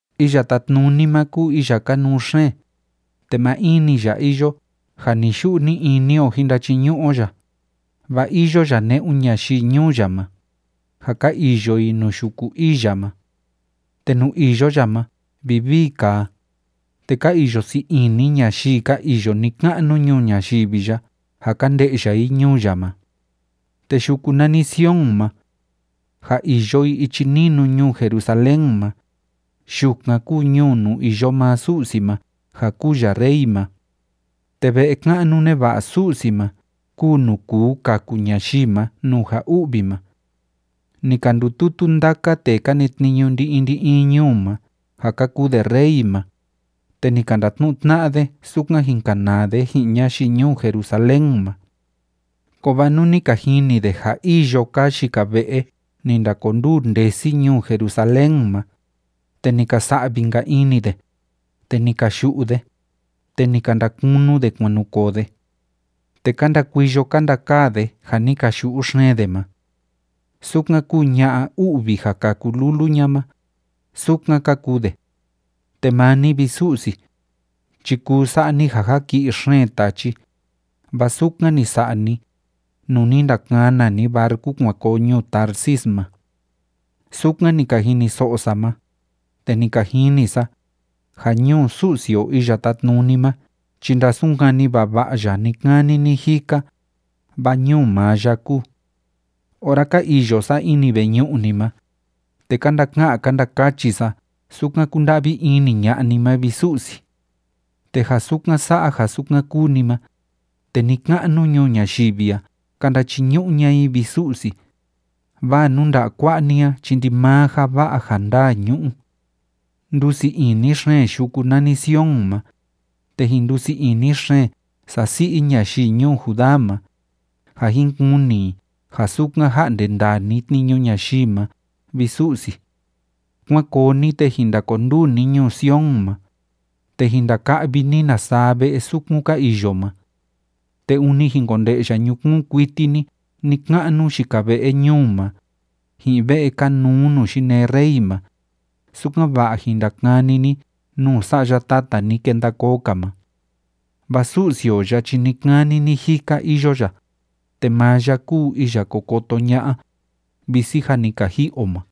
Iya Tátnuni ma kúu iya kanuu xeen, te maa in‑ni ya iyo ja ni‑yu'u ni‑ini o jin ndachiñu'u o ya, vaa iyo ya ne'un ñayii ñuu ya ma, ja ka iyo i nuu yuku ii ya ma. Te nuu iyo ya ma vivii kaa, te ka iyo sii ini ñayii ka iyo ni‑ka'nu ñuu ñayivi ya ja ka nde'ya i ñuu ya ma. Te yuku nani Sion ma, ja iyo i ichi ninu ñuu Jerusalén ma, yukan kúu ñuu nuu iyo maa Su'si ma ja kúu ya Rey ma. Te ve'e ka'nu neva'a Su'si ma kúu nuu kuu kaku ñayii ma nuu ja u'vi ma. Ni ka ndututu ndaka tee ka netniñu ndi‑in ndi‑in ñuu ma ja ka kuu de rey ma, te ni ka ndatnu'u tna'a de sukan jin kanaa de ji'in ñayii ñuu Jerusalén ma. Kovaa nuu ni ka jini de ja îyo kaa yika ve'e ni ndakonduu ndesi ñuu Jerusalén ma, te ni ka sa'vi‑nka ini de, te ni ka yu'u de, te ni ka ndakunu de kuan nu koo de. Te ka ndakuiyo ka ndakaa de ja ni ka yu'u xeen de ma. Sukan kúu ña'a u'vi ja kâku lulu ña ma, sukan ka kuu de. Te maa ni, vi Su'si, chi kuu sa'a ni ja jaki'i xeen tachi, vaa sukan ni sa'a ni, nuu ni ndakana ni barcu kuan koo ñuu Tarsis ma. Sukan ni ka jiniso'o sa ma, te ni ka jini sa, ja ñuu Su'si o Iya Tátnuni ma chi ndasunkani vava'a ya ni‑kani ni‑jika, vaa ñuu maa ya kúu. Ora ka iyo sa ini veñu'u ni ma, te ka ndaka'an ka ndakachi sa sukan kúnda'vi ini ña'a ni ma, vi Su'si. Te ja sukan sa'a ja sukan kúu ni ma, te ni‑ka'nu ñuu ñayivi a ka ndachiñu'u ña'a i, vi Su'si, vaa nuu nda'a kua'a ni a chi ndimaa ja va'a ja ndaa ñu'u. Ndusii ini xeen yuku nani Sion ma, te jin ndusii ini xeen sasi'i ñayii ñuu Judá ma, ja jin kuni i ja sukan ja'nde ndaa ni tniñu ñayii ma, vi Su'si. Kuán koo ni, te jin ndakonduu ni ñuu Sion ma, te jin ndaka'vi ni na saa ve'e sukun ka iyo ma. Te ûni jin konde'ya ñukuun kuiti ni ni‑ka'nu yika ve'e ñuu ma, ji'in ve'e kanuu nuu yinee rey ma, sukan‑va'a jin ndakani ni nuu sa'ya tata ni kenda koo‑ka ma. Vaa Su'si o ya chi ni‑kani ni‑jika iyo ya, te maa ya kúu iya ko koto ña'a, visi jâ ni ka ji'i o ma.